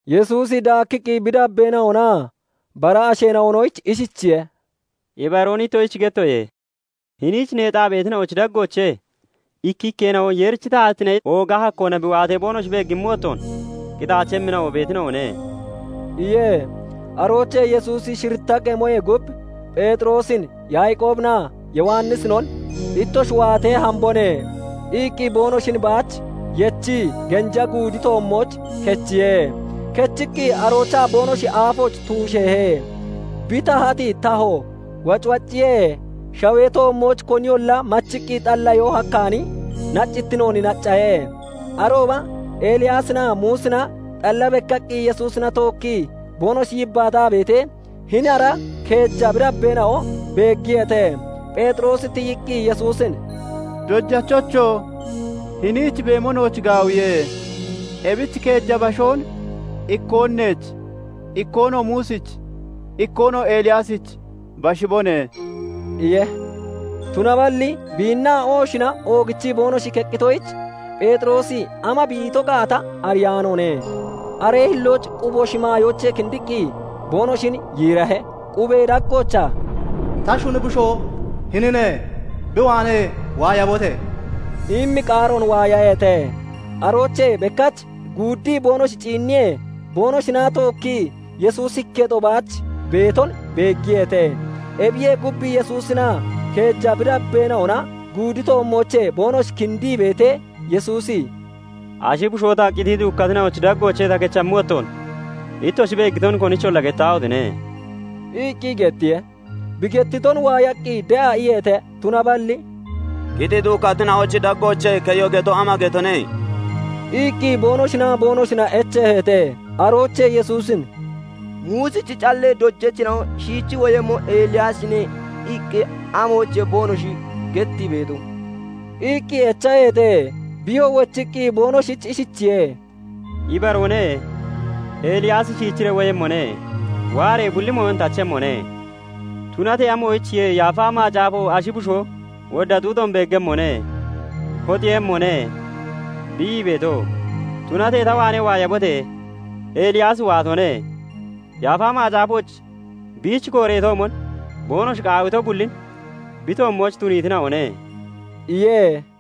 Yesuusi daakkiqqi bi dabbeena'onaa bara asheena'onoyich ishichiye:- "Ibaroon ittoshich gettoye; hiniich neexaa beetina'ochi daggoochee ikkikkeena'o Yeerichi taatittine ooga hakkoona bi waatee boonoshi beegimmi wottoon qitaachemmina'o beetina'one" iye. Aroochee Yesuusi shiritta qemoyee gub Pheexiroosin, Yaaqoobinaa Yowannisinon "Ittoshi waatee hambone" iqqi boonoshin baach yechii genja guudi toommooch kechiye. Kechiqqi aroochaa boonoshi aafooch tuusheehe. Bi tahati tahoo wacwacciye; shawee toommooch koniyolla machiqqi xalliyoo hakkaani naccititnoon naccahe. Arooba Eliyaasinaa Muusina xalla bekkaqqi Yesuusina tookkii boonoshi yibbaataa beetee, hini ara keeja bi dabbeena'o beeggiyeete. Pheexiroosi tiyiqqi Yesuusin "Dojachocho! Hiniich beemo nooch gaawiye. Ebich keeja bashoon ikkoon neech, ikkoonoo Muusich, ikkoonoo Eliyaasich bashibone" iye. Tunaballi biinnaa ohoshina oogichii boonoshi keqqitoyich, Pheexiroosi ama bi ito gaata ariyaanoone. Aree hillooch qubo shimaayoochee kindiqqi boonoshin yiirahe. Qubee daggoochaa "Ta shuni bushoo hinine; bi waanee waayabote!" immi qaaroon waayaheete. Aroochee bekkach guuddii boonoshi ciinniyee, boonoshina tookkii Yesuusi ikketo baach beeton beeggiyeete. Ebiyee gub, Yesuusinaa keeja bi dabbeena'ona guudi toommoochee boonoshi kindii beetee, Yesuusi "Ashi bushoo ta qitii duukkatina'ochi daggoochee ta kechammi wottoon, ittoshi beeggiton konicholla gettaahotine!" iqqi gettiye. Bi gettiton waayaqqi de'a iyeete. Tunaballi " 'Qitii duukkatina'ochi daggoochee keyo' geto, ama getone?" iqqi boonoshinaa boonoshina echeeheete. Aroochee Yesuusin "Muusichi callee dojachina'o 'Shiichi woyemmo Eliyaasine' iqqi amoyichiye boonoshi gettii beeto?" iqqi echaheete. Biyoo wochiqqi boonoshich ishichiye:- "Ibaroone; Eliyaasi shiichiree woyemmone; waaree bulli mooyon tachemmone. Tunatee amoyichiye Yaafa Macaafo 'Ashi bushoo wodda xuuxoon beeggemmone; hoxeeyemmone' bi ii beeto? Tunatee ta waanee waayabote! Eliyaasi waatone. Yaafa Macaafooch biich kooreetoomon boonoshi qaawito bullin bi toommooch tuniitina'one" iye.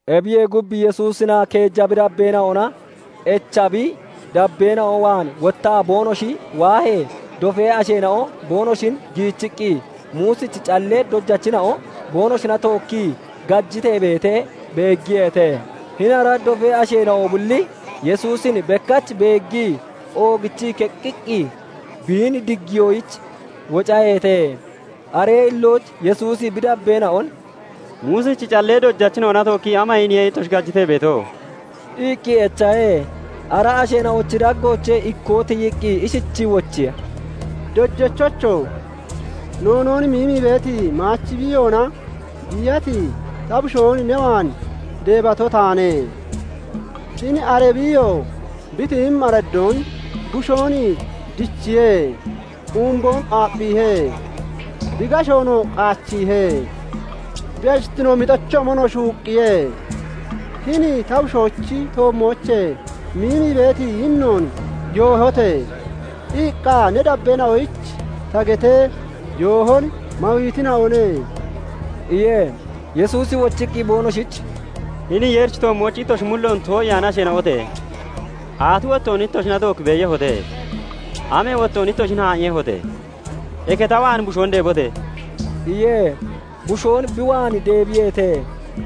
Ebiyee gub, Yesuusinaa keeja bi dabbeena'ona echa bi dabeena'o waan wottaa boonoshi waahee, dofee asheena'o boonoshin giichiqqi, Muusichi callee dojachina'o boonoshina tookkii gajitee beetee beeggiyeete. Hini ara dofee asheena'o bulli Yesuusin bekkach beeggii oogichii keqqiqqi biin diggiyoyich wocaheete. Aree hillooch Yesuusi bi dabbeena'on "Muusichi callee dojachina'ona tookkii ama iiniye ittoshi gajitee beeto?" iqqi echahe. Ara asheena'ochi daggoochee ikkoo tiyiqqi ishichii wochiye; "Dojachocho! Noonoon miimii beeti maachi biiyoona biiyati ta bushoon ne waan deebato taane. Hini ara biiyoo bi tiyimmi araddoon bushoon dichiye. Umboon aapphiihe; bi gashoon qaachiihe; bi ashittinoo mixochoomon shuuqqiye. 'Hini ta bushoochi toommoochee miimii beeti yinnoon yoohote!' iqqa ne dabbeena'oyich ta getee, yoohon mawiitina'one" iye. Yesuusi wochiqqi boonoshich "Hini Yeerichi toommooch ittoshi mulloon too'iyaani asheena'ote! Aati wottoon ittoshina tookki beeyehote? Amee wottoon ittoshin haa'iiyehote? Eke ta waan bushoon deebote!" iye. Bushoon bi waan deebiyeete.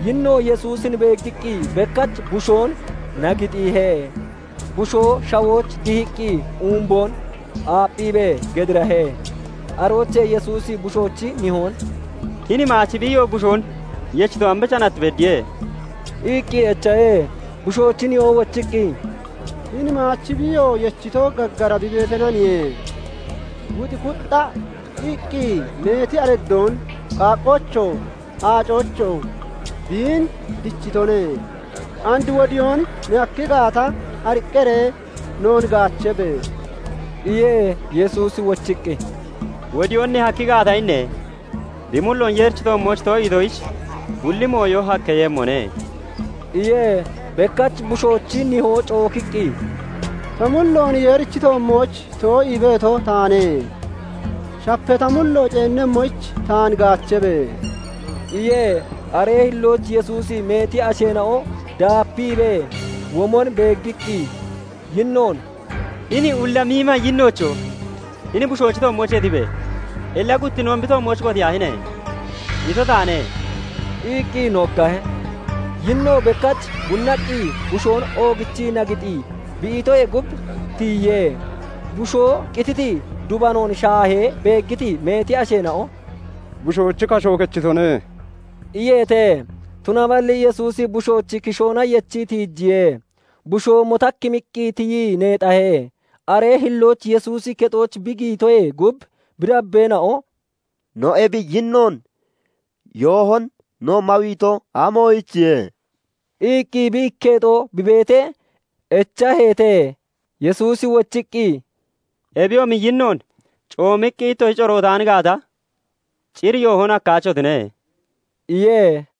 Yinno Yesuusin beeggiqqi bekkach bushoon nagixiihe. Bushoo shawooch dihiqqi umboon aapphiibee gedirahe. Aroochee Yesuusi bushoochi nihoon "Hini maachi biiyoo bushoon yechito ambicha nat beddiye?" iqqi echahe. Bushoochi nihoo wochiqqi, "Hini maachi biiyoo yechito gaggara bi beeteenaniye. Wuxi kuxxa iqqi meeti araddoon qaaqqoochoo, aacoochoo biin dichitone. And wodiyoon ne hakki gaata, ariqqaree noon gaachabe!" iye. Yesuusi wochiqqi, " 'Wodiyoon ne hakki gaata' inne? Bi mulloon Yeerichi toommooch too'iitoyich, bulli mooyon hakkeeyemmone" iye. Bekkach bushoochi nihoo cookiqqi, "Ta mulloon Yeerichi toommooch too'ii beeto taane; shapa ta mullo ceenemmoyich taan gaachabe!" iye. Aree hillooch Yesuusi meeti asheena'o daapiibee womon beeggiqqi, yinnoon "Hini ulla miima yinnoocho! 'Hini bushoochi toommoochee tibe! Illa guttinnoon bi toommooch kotiyaahine!' ito taane" iqqi noggahe. Yinno bekkach bunnaqqi bushoon oogichii nagixii bi itoyee gub, tiyiye. Bushoo qititi dubanoon shaahee beeggiti meeti asheena'o "Bushoochi kasho kechitone" iyeete. Tunaballi Yesuusi bushoochi kishoona yechii tiijiye. Bushoo motakkimmiqqi tiyii neexahe. Aree hillooch Yesuusi kexooch bi giyitoyee gub, bi dabbeena'o "No ebi yinnoon yoohon no mawiito amoyichiye?" iqqi bi ikketo bi beetee echaheete. Yesuusi wochiqqi, "Ebiyoomi yinnoon [coomiqqi] ittoshi corootaan gaata, cir yoohon hakkaachotine" iye.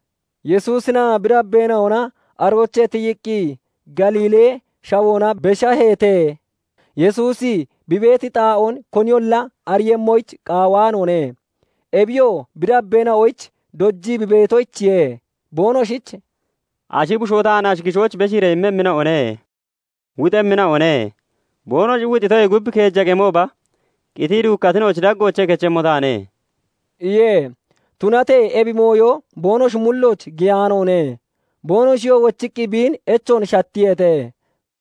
Yesuusinaa bi dabbeena'ona aroochee tiyiqqi Galiilee shawoona beshaheete. Yesuusi bi beeti xaa'oon koniyolla ariiyemmoyich qaawaanoone. Ebiyoo bi dabbeena'oyich dojii bi beetoyichiye. Boonoshich "Ashi bushoo taan ashi kishooch beshiiree immemmina'one; wuxemmina'one; boonoshi wuxitoyee gub keeja qemooba qitii duukkatina'ochi daggoochee kechemmo taane" iye. Tunatee ebi mooyo boonoshi mullooch giyaanoone. Boonoshiyoo wochiqqi biin echoon shattiyeete.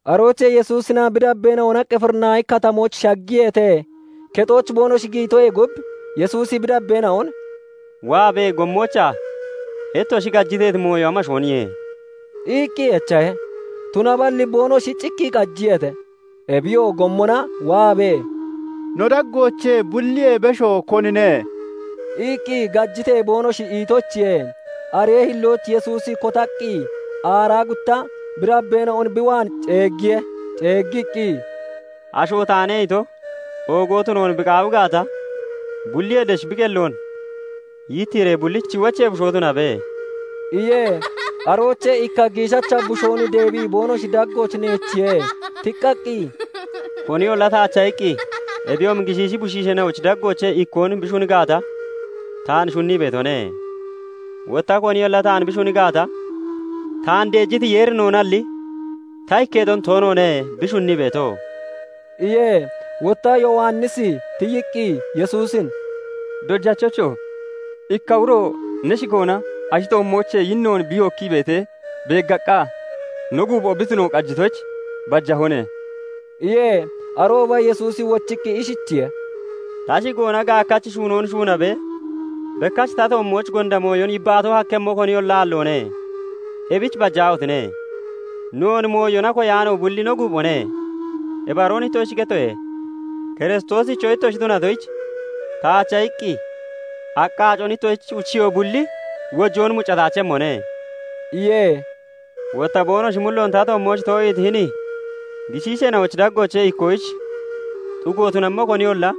Aroochee Yesuusinaa bi dabbeena'ona Qifirinaahi Katamooch shaggiyeete. Kexooch boonoshi giyitoyee gub, Yesuusi bi dabbeena'on "Waabee gommoochaa ittoshi gajiteeti mooyo amooniye?" iqqi echahe. Tunaballi boonoshi cikkii qajiyeete. Ebiyoo gommona waabee, "No daggoochee bulliyee besho konine?" iqqi gajitee boonoshi itoyichiye. Aree hillooch Yesuusi kotaqqi aaraa gutta bi dabbeena'on bi waan ceeggiye. Ceeggiqqi, " 'Asho taane' ito oogo tunoon bi qaawi gaata, bulliyee desh bi qelloon yittiiree bullichi wochee bushoo tunabe" iye. Aroochee ikka giishacha bushoon deebii boonoshi daggooch neechiye. Tiqqaqqi, "Koniyolla taacha iqqi, ebiyoomi gishiishi bushisheena'ochi daggoochee ikkoon bi shuni gaata, taan shunnii beetone. Wotta koniyolla taan bi shuni gaata, taan deejiti Yeerinoonalli, ta ikketon toonoone bi shunnii beeto" iye. Wotta Yowannisi tiyiqqi Yesuusin "Dojachocho! Ikka uro ne shigoona ashi toommoochee yinnoon bi yookkii beetee beeggaqqa, no guupho tuno bi qajitoyich bajahone" iye. Arooba Yesuusi wochiqqi ishichiye:- "Ta shigoona gaakkachi shuunoon shuunaabee bekkach ta toommooch gonda mooyon yibbaato hakkemmo koniyolla aalloone; ebichi bajaahotine! Noon mooyona koyaano bulli no guuphone. Ibaroon ittoshich gettoye; Kiristoosicho ittoshi tunatoyich, taacha iqqi aqqa aacon ittoshich uchiyoo bulli wojoon mucataachemmone" iye. "Wotta boonoshi mulloon ta toommooch too'iiti hini giishiisheena'ochi daggoochee ikkoyich xugo tunammo koniyolla,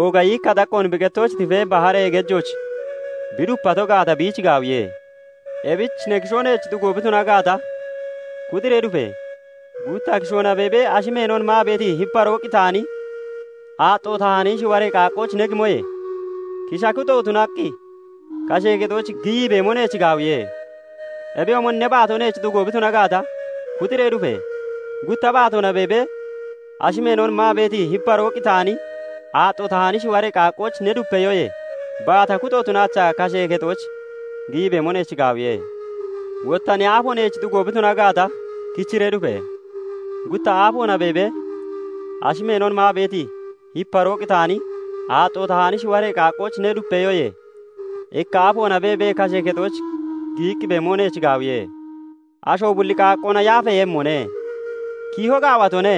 ooga yiikka xaqqoon bi qettooch tifee baharee gejooch bi dupato gaata, biich gaawiye. Ebich ne kishoo neech xugo bi tuna gaata, kuxiree dufe! Gutta kishoona beebee [ashi meenon maa beeti hiparoo qitaani,] aaxxo tahaani shiwaree qaaqqooch ne gimoye, kisha kuxo tunaqqi kashee kexooch giyii beemo neech gaawiye. Ebiyoomon ne baato neech xugo bi tuna gaata, kuxiree dufe! Gutta baatoona beebee, [ashi meenon maa beeti hiparoo qitaani, aaxxo tahaani] shiwaree qaaqqooch ne dupeyoyee, baata kuxo tunaachaa kashee kexooch giyii bemo neech gaawiye. Wotta ne aafo neech xugo bi tuna gaata, kichiree dufe! Gutta aafoona beebee, ashi meenon maa beeti hiparoo qitaani, aaxxo tahaani shiwaree qaaqqooch ne dupeyoyee, ikka aafoona beebee kashee kexooch giyiqqi beemo neech gaawiye. Asho bulli qaaqqoona yaafeeyemmone. "Kiiho gaawatone;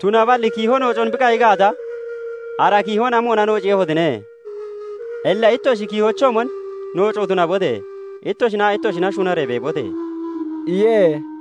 tunaballi kiiho noocon bi qayi gaata, ara kiihon amoona noociiyehotine? Illa ittoshi kiihochoomon nooco tunabote! Ittoshinaa ittoshina shunaree beebote!" iye.